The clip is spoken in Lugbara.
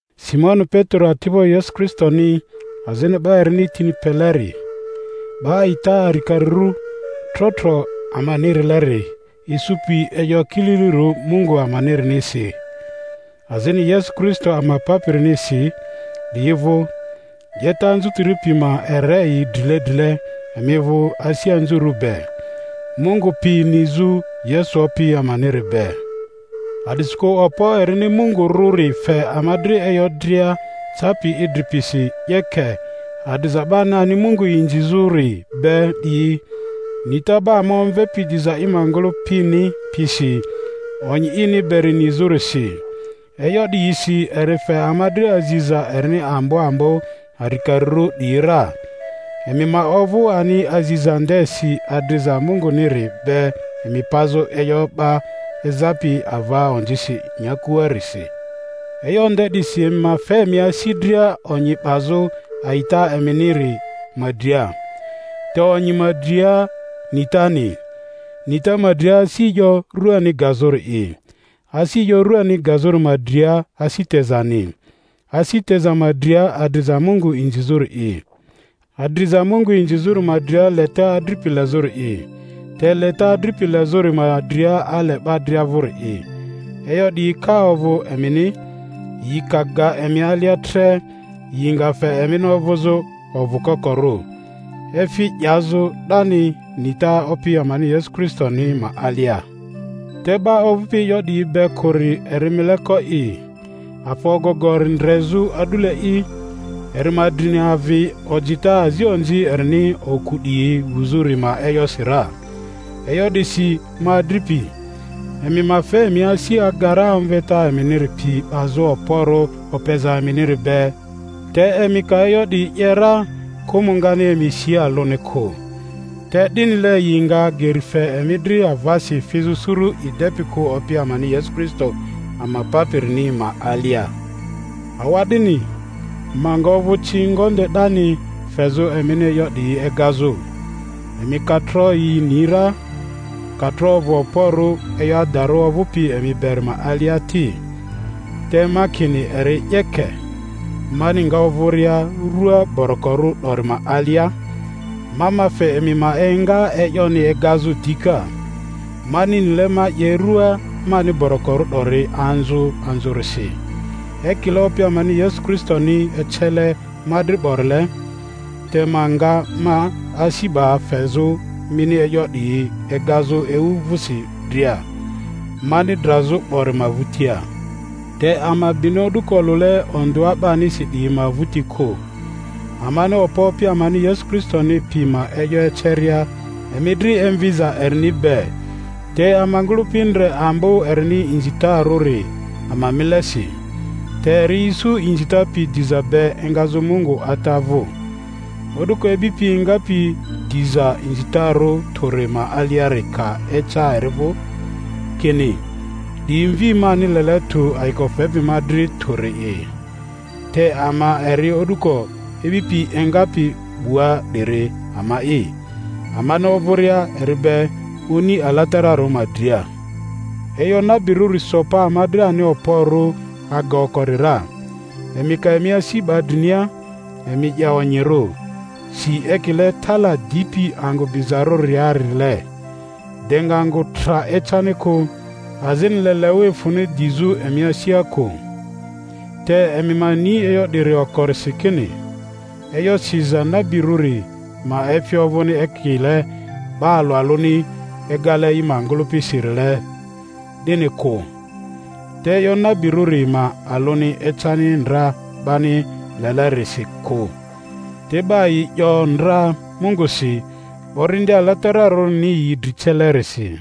Simoni Petero, ati'bo Yesu Kristoni azini 'ba erini tini peleri, 'Ba a'ita arikarirᴜ trotro ama-nirileri isupi e'yo kililirᴜ Mungu amanirinisi, azini Yesu Kristo ama Papirinisi 'diyi vᴜ: 'Yeta anzutiri pi ma ere yi drile drile emi vᴜ asi anzurᴜ be, Mungu pi nizᴜ Yesu Opi amaniri be. A'disikᴜ okpo erini Mungu rᴜri fe ama dri e'yo dria capi idri pisi 'yeke, adriza 'bani ani Mungu inzi zᴜri be 'diyi, nita 'ba ama omvepi diza i ma ngᴜlᴜpini pisi onyi ini beri nizᴜrisi; e'yo 'diyisi eri fe ama dri aziza erini ambo ambo arikarirᴜ 'diyi ra, emi ma ovᴜ ani aziza ndesi adriza Munguniri be emi pazᴜ e'yo 'ba ezapi ava onzisi nyakuarisi E'yo nde 'disi emi ma fe emi asi dria onyi o'bazᴜ a'ita eminiri ma dria, te onyi ma dria nitani, nita ma dria asi e'yo ruani gazᴜri'i, asi e'yo rᴜani gazᴜri ma dria asi tezani, asi teza ma dria adriza Mungu inzizᴜri'i, adriza Mungu inzizᴜri ma dria leta adripi lezᴜri'i, te leta adripi lezᴜri ma dria ale 'ba dria vᴜri'i. E'yo 'diyi ka ovᴜ emini, yi ka ga emi alia tre, yi nga fe emini ovᴜzᴜ ovᴜ kokorᴜ, efi 'yazᴜ 'dani, nita Opi amani Yesu Kristoni ma alia. Te 'ba ovᴜpi e'yo 'diyi be kᴜri eri mileko'i, afa ogogori ndrezᴜ a'dule'i, eri ma drini avi ojita azi onzi erini oku 'diyi wuzᴜri ma e'yosi ra. E'yo 'disi, ma adripi, emi ma fe emi asi aga ra omveta eminiri pi 'bazᴜ okporᴜ opeza eminiri be, te emi ka e'yo 'diyi 'ye ra kᴜmᴜ ngani emi si alᴜni kᴜ; te 'dinile yi nga geri fe emi dri avasi fizᴜ suru i depi kᴜ Opi amani Yesu Kristo ama Papiriniri ma alia. Awa'dini, ma nga ovᴜ ci ngonde 'dani fezᴜ emini e'yo 'diyi egazᴜ, emi ka tro yi ni ra, ka tro ovᴜ okporᴜ e'yo adarᴜ ovᴜpi emi beri ma alia ti. Te ma kini eri 'yeke, mani nga ovᴜria rua borokorᴜ 'dori ma alia, ma ma fe emi ma enga e'yoni egazᴜ dika, mani nile ma 'ye rᴜa mani borokorᴜ 'dori anzᴜ anzᴜrisi, ekile Opi amani Yesu Kristoni ecele ma dri 'borile. Te ma nga ma asi 'ba fezᴜ mini e'yo 'diyi egazᴜ ewu vᴜsi dria, mani drazᴜ 'bori ma vᴜtia. Te ama bini o'dᴜko olᴜle ondᴜa 'banisi 'diyi ma vᴜti kᴜ, amani okpo Opi amani Yesu Kristoni pi ma e'yo eceria emi dri emviza erini be, te ama ngᴜlᴜpi ndre ambo erini inzitarᴜri ama milesi. Te eri isu inzita pi diza be engazᴜ Mungu Ata vᴜ, o'duko ibipi engapi diza inzitarᴜ tᴜri ma aliari ka eca eri vᴜ, kini, 'Di Mvi mani lele tᴜ ayiko fepi ma dri tᴜri'i. Te ama eri o'duko ibipi engapi 'bua 'diri ama'i, amani ovᴜria eri be oni alatararᴜ ma dria. E'yo nabirᴜri so pa ama dri ani okporᴜ aga okori ra. Emi ka emi asi 'ba drinia, emi 'ye onyirᴜ, si ekile tala dipi angᴜ bizarᴜriarile, de nga angᴜ tra ecani kᴜ, azini leleᴜ efᴜni dizᴜ emi asia kᴜ. Te emi ma ni e'yo 'diri okorisi, kini e'yo siza nabirᴜri ma efi ovᴜni ekile 'ba alᴜ alᴜni egale yi ma ngᴜlᴜpisirile 'dini kᴜ. Te e'yo nabirᴜri ma alᴜni ecani ndra 'bani lelenirisi kᴜ, te 'ba yi 'yo ndra Mungusi, Orindi Alatararᴜni yi dri celerisi.